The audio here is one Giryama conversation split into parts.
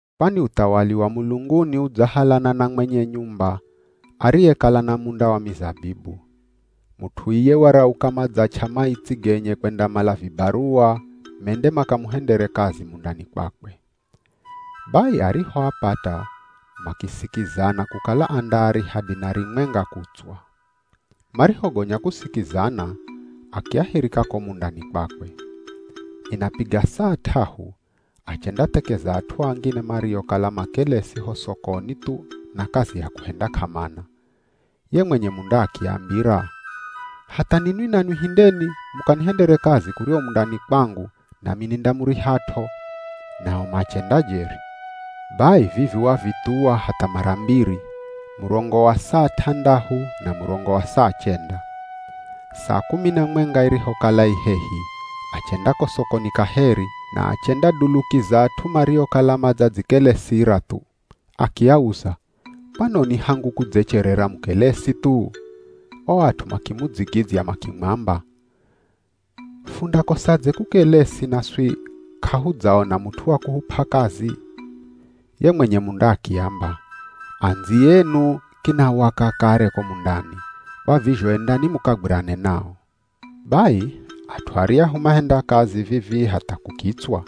“Kwani uthawali wa mulunguni udzahalana na mwenye nyumba ariyekala na munda wa mizabibu. Mut'u iye warauka madzach'a maitsi genye kwendamala vibaruwa mende makamuhendere kazi mundani kwakwe. Bai arihoapata makisikizana kukala andaariha dinari mwenga kutswa. Marihogonya kusikizana akiahirika ko mundani kwakwe. Inapiga saa t'ahu achendathekeza at'u angine mariokala makelesi ho sokoni thu na kazi ya kuhenda k'amana. Ye mwenye munda akiambira, ‘Hatha ninwi nanwi hindeni mukanihendere kazi kuryahu mundani kwangu, nami nindamurihat'o.’ Nao machenda jeri. Bai vivi wavithuwa hatha mara mbiri, murongo wa saa t'andahu na murongo wa saa chenda. Saa kumi na mwenga irihokala i hehi achenda ko sokoni kaheri, na achendadulukiza at'u mariokala madzadzikelesira thu. Akiauza, ‘Kwanoni hangu kudzecherera mukelesi thu?’ O at'u makimudzigidzya makimwamba, ‘Fundakosadze kukelesi naswi k'ahudzaona mut'u wa kuhup'a kazi?’ Ye mwenye munda akiamba, ‘Andziyenu kinawaka kare ko mundani, kwa vizho endani mukagwirane nao.’ “Bai, at'u aryahu mahenda kazi vivii hatha kukitswa.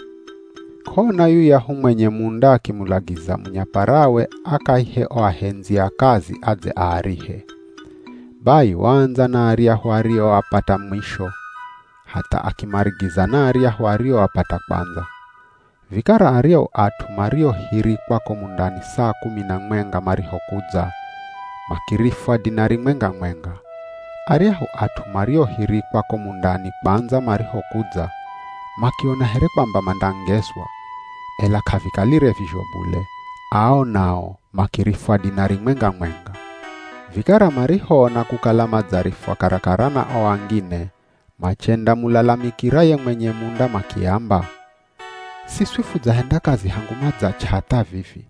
K'ona yuyahu mwenye munda akimulagiza munyaparawe akaihe o ahendzi a kazi adze aarihe. Bai, waandza na aryahu arioapata mwisho, hatha akimarigiza na aryahu arioapata kwandza. Vikara aryahu at'u mariohirikwa ko mundani saa kumi na mwenga marihokudza, makirifwa dinari mwenga-mwenga. Aryahu at'u mariohirikwa ko mundani kwandza marihokudza, makiona here kwamba mandangezwa, ela k'avikalire vizho bule, ao nao makirifwa dinari mwenga-mwenga. Vikara marihoona kukala madzarifwa karakara na o angine, machendamulalamikira ye mwenye munda makiamba, ‘Siswi fudzahenda kazi hangu madzach'a hatha vivi.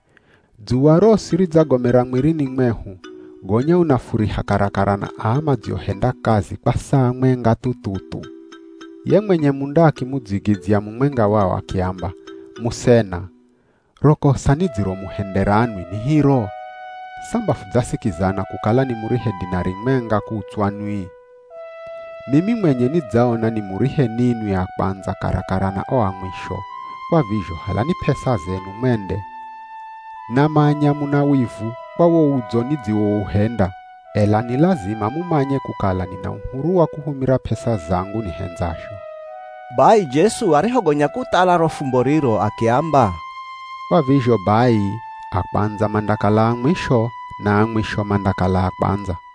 Dzuwa rosi ridzagomera mwirini mwehu, gonya unafuriha karakara na aa madziohenda kazi kwa saa mwenga thu-thu-thu.’ Ye mwenye munda akimudzigidzya mumwenga wao akiamba, ‘Musena, ro kosa nidziromuhendera nwi ni hiro? Samba fudzasikizana kukala nimurihe dinari mwenga kutswa nwi? Mimi mwenye nidzaona nimurihe ninwi a kwandza karakara na o a mwisho, kwa vizho halani p'esa zenu mwende. Namanya muna wivu kwa wo udzo nidziwouhenda. Ela ni lazima mumanye kukala nina uhuru wa kuhumira p'esa zangu nihendzazho.’” Bai Jesu arihogonya kuthala ro fumbo riro akiamba, “Kwa vizho bai a kwandza mandakala a mwisho, na a mwisho mandakala a kwandza.”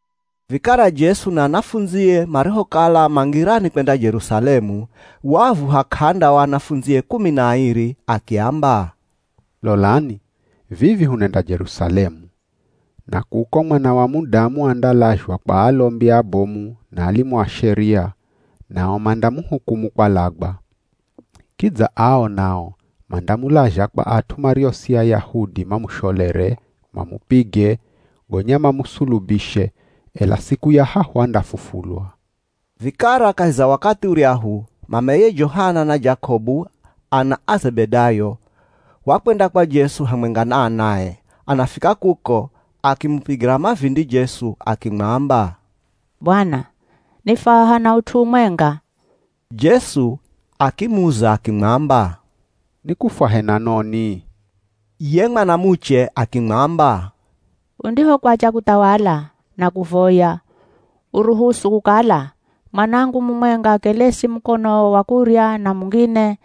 Vikara Jesu na anafundzie marihokala ma ngirani kwenda Jerusalemu, waavuha k'anda o anafundzie kumi na airi akiamba, “Lolani, vivi hunenda Jerusalemu. Na kuko Mwana wa Mudamu andalazhwa kwa alombi abomu na alimu a Sheria, nao mandamuhukumu kwalagwa. Kidza ao nao mandamulazha kwa at'u mario si Ayahudi mamusholere, mamupige, gonya mamusulubishe, ela siku ya hahu andafufulwa.” Vikara kahi za wakathi uryahu, mameye Johana na Jakobu ana a Zebedayo, wakwenda kwa Jesu hamwenga na anae. Anafika kuko, akimupigira mavindi Jesu akimwamba, “Bwana, nifwaha na ut'u umwenga.” Jesu akimuza akimwamba, “Nikufwahe na noni?” Ye mwanamuche akimwamba, “Undihokwacha kuthawala, nakuvoya, uruhusu kukala, mwanangu mumwenga akelesi mukonowo wa kurya na mungine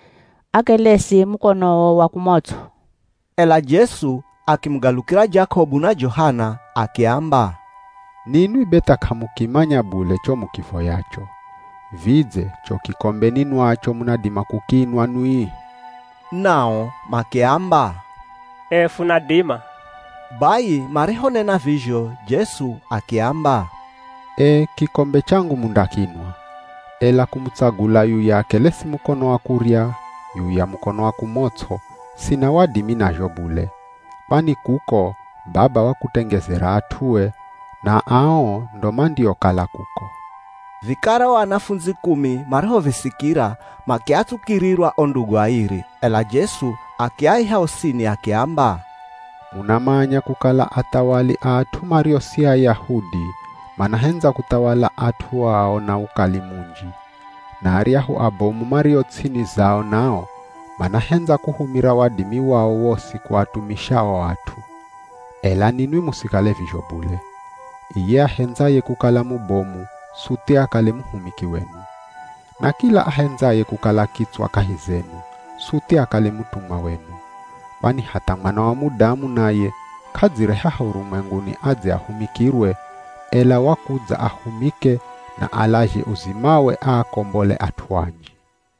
akelesi mukonowo wa kumots'o.” Ela Jesu akimugalukira Jakobu na Johana akiamba, “Ninwi be tha k'amukimanya bule cho mukivoyacho. Vidze cho kikombe ninwacho munadima kukinwa nwi?” Nao makiamba, “Ee funadima.” Bai marihonena vizho Jesu akiamba, “Ee kikombe changu mundakinwa. Ela kumutsagula yuya akelesi mukono wa kurya, yuya mukono wa kumots'o, sina wadimi nazho bule. Kwani kuko, Baba wakutengezera at'ue, na ao ndo mandiokala kuko.” Vikara o anafundzi kumi marihovisikira, makiatsukirirwa o ndugu airi. Ela Jesu akiaiha osini akiamba, “Munamanya kukala athawali a at'u mario si Ayahudi manahendza kuthawala at'u ao na ukali munji. Na aryahu abomu mario ts'ini zao nao, manahendza kuhumira wadimi wao wosi kuatumisha o at'u. Ela ninwi musikale vizho bule. Iye ahendzaye kukala mubomu suthi akale muhumiki wenu. Na kila ahendzaye kukala kitswa kahi zenu, suthi akale mutumwa wenu. Kwani hatha Mwana wa Mudamu naye k'adzire haha urumwenguni adze ahumikirwe, ela wakudza ahumike na alazhe uzimawe aakombole at'u anji.”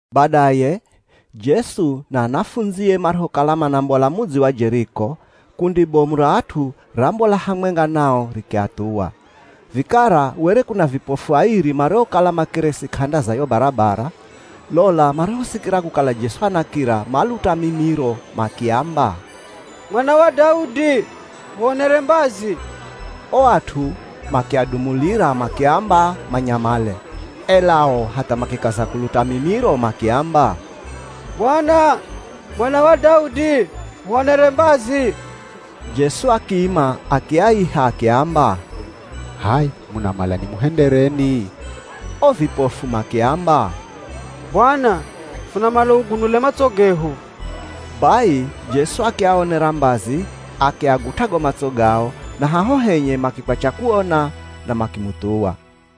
Badaye, Jesu na anafundzie marihokala manambola mudzi wa Jeriko, kundi bomu ra at'u rambola hamwenga nao rikiathuwa. Vikara were kuna vipofu airi mariokala makelesi k'anda za yo barabara. Lola marihosikira kukala Jesu anakira, maluta mimiro makiamba, “Mwana wa Daudi huonere mbazi!” O at'u makiadumulira makiamba manyamale, ela o hatha makikaza kuluta mimiro makiamba, “Bwana, mwana wa Daudi huonere mbazi!” Jesu akiima, akiaiha akiamba, “H'aya munamala nimuhendereni?” O vipofu makiamba, “Bwana, funamala ugunule matso gehu.” Bai Jesu akiaonera mbazi akiagut'a go matso gao, na haho henye makikwacha kuona na makimuthuwa.